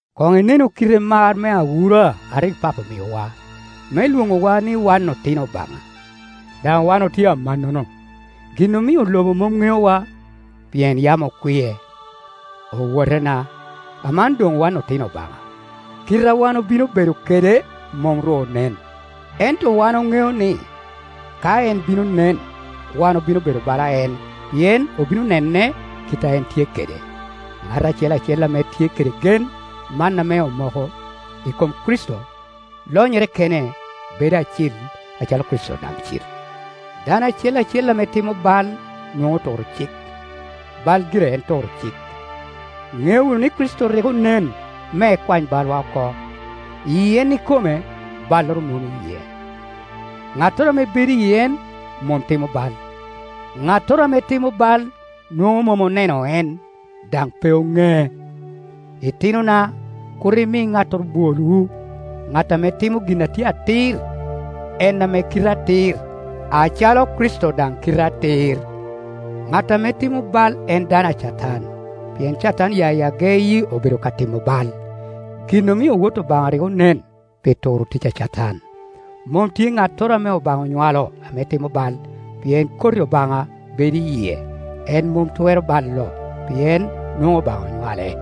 Koŋ inenu kite mar me awura a rik Papo omiowa, me lwoŋowa ni wan otino Obaŋa; daŋ wan otye amannono. Gin omio lobo mom ŋeowa, pien yam okwie. Owotena, aman doŋ wan otino Obaŋa; kite a wan obino bedo kede mom ru onen, ento wan oŋeo ni, ka en bino nen, wan obino bedo bala en, pien obino ne ne kite a en tye kede. Ŋat acel acel ame tye kede gen man ame omoko i kom Kricito, lonyere kene bedo acil, acalo Kricito daŋ cil. Dano acel acel ame timo bal nwoŋo aturo cik; bal gire en turo cik. Iŋeo wunu ni Kricito rik onen me ekwany balwa oko; i en ikome balloro mom iye. Ŋattoro ame bedo i en mom timo bal; ŋattoro ame timo bal nwoŋo mom oneno en, daŋ pe oŋee. Itinona, kur imi ŋattoro bwolwu. Ŋat ame timo gin a tye atir, en ame kite atir, acalo Kricito daŋ kite atir. Ŋat ame timo bal en dano a Catan; pien Catan ya i ageyi obedo ka timo bal. Gin omio Wot Obaŋa rik onen, pi turo tic a Catan. Mom tye ŋattoro ame Obaŋa onywalo ame timo bal, pien koti Obaŋa bedo i yie; en mom twero balo, pien nwoŋo Obaŋa onywale.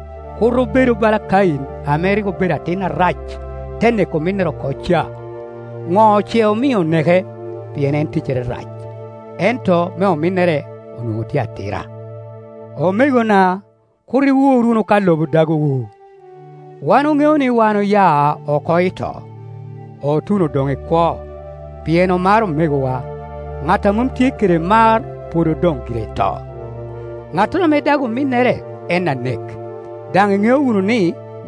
Kur obedu bala Kain ame rik obedo atin Arac, te neko ominnere oko ca, ŋo ce omio oneke? Pien en ticcere rac, ento me ominnere onwoŋo tye atira. Omegona, kur iwur wunu ka lobo dagowu. Wan oŋeo ni wan oya oko i to, otuno doŋ i kwo, pien omaro omegowa. Ŋat a mom tye kede mar pwod odoŋ gire i to. Ŋattoro ame dago ominnere en anek, daŋ iŋeo wunu ni,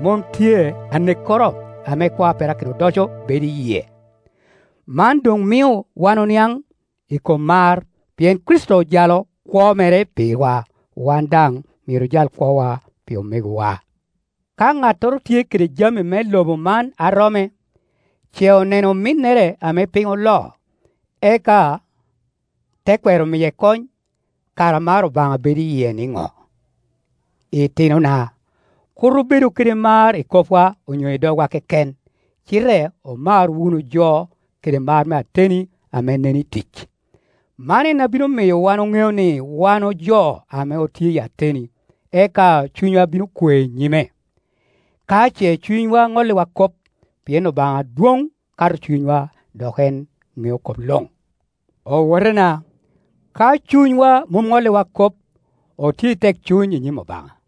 mom tye anekkoro ame kwo a perakino odoco bedo i yie. Man doŋ mio wan oniaŋ i kom mar, pien Kricito ojalo kwo mere pirwa. Wan daŋ myero ojal kwowa pi omegowa. Ka ŋattoro tye kede jami me lobo man a romme, ce oneno ominnere ame piny oloo, eka te kwero miye kony, kara mar Obaŋa bedo i yie niŋo? Itinona, kur obedu kede mar i kopwa onyo i dogwa keken, cite omar wunu jo kede mar me ateni ame nen i tic. Man en a bino miyo wan oŋeo ni wan ojo ame otye i ateni, eka cunywa bino kwe i nyime, ka ce cunywa ŋolliwa kop, pien Obaŋa dwoŋ kato cunywa dok en ŋeo kop luŋ. Owotena, ka cunywa mom ŋolliwa kop, otye i tekcuny i nyim Obaŋa;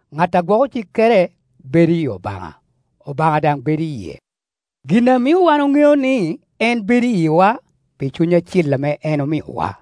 Ŋat a gwoko cikkere bedo i Obaŋa, Obaŋa daŋ bedo i yie. Gin a mio wan oŋeo ni en bedo i yiwa, pi Cuny Acil ame en omiowa.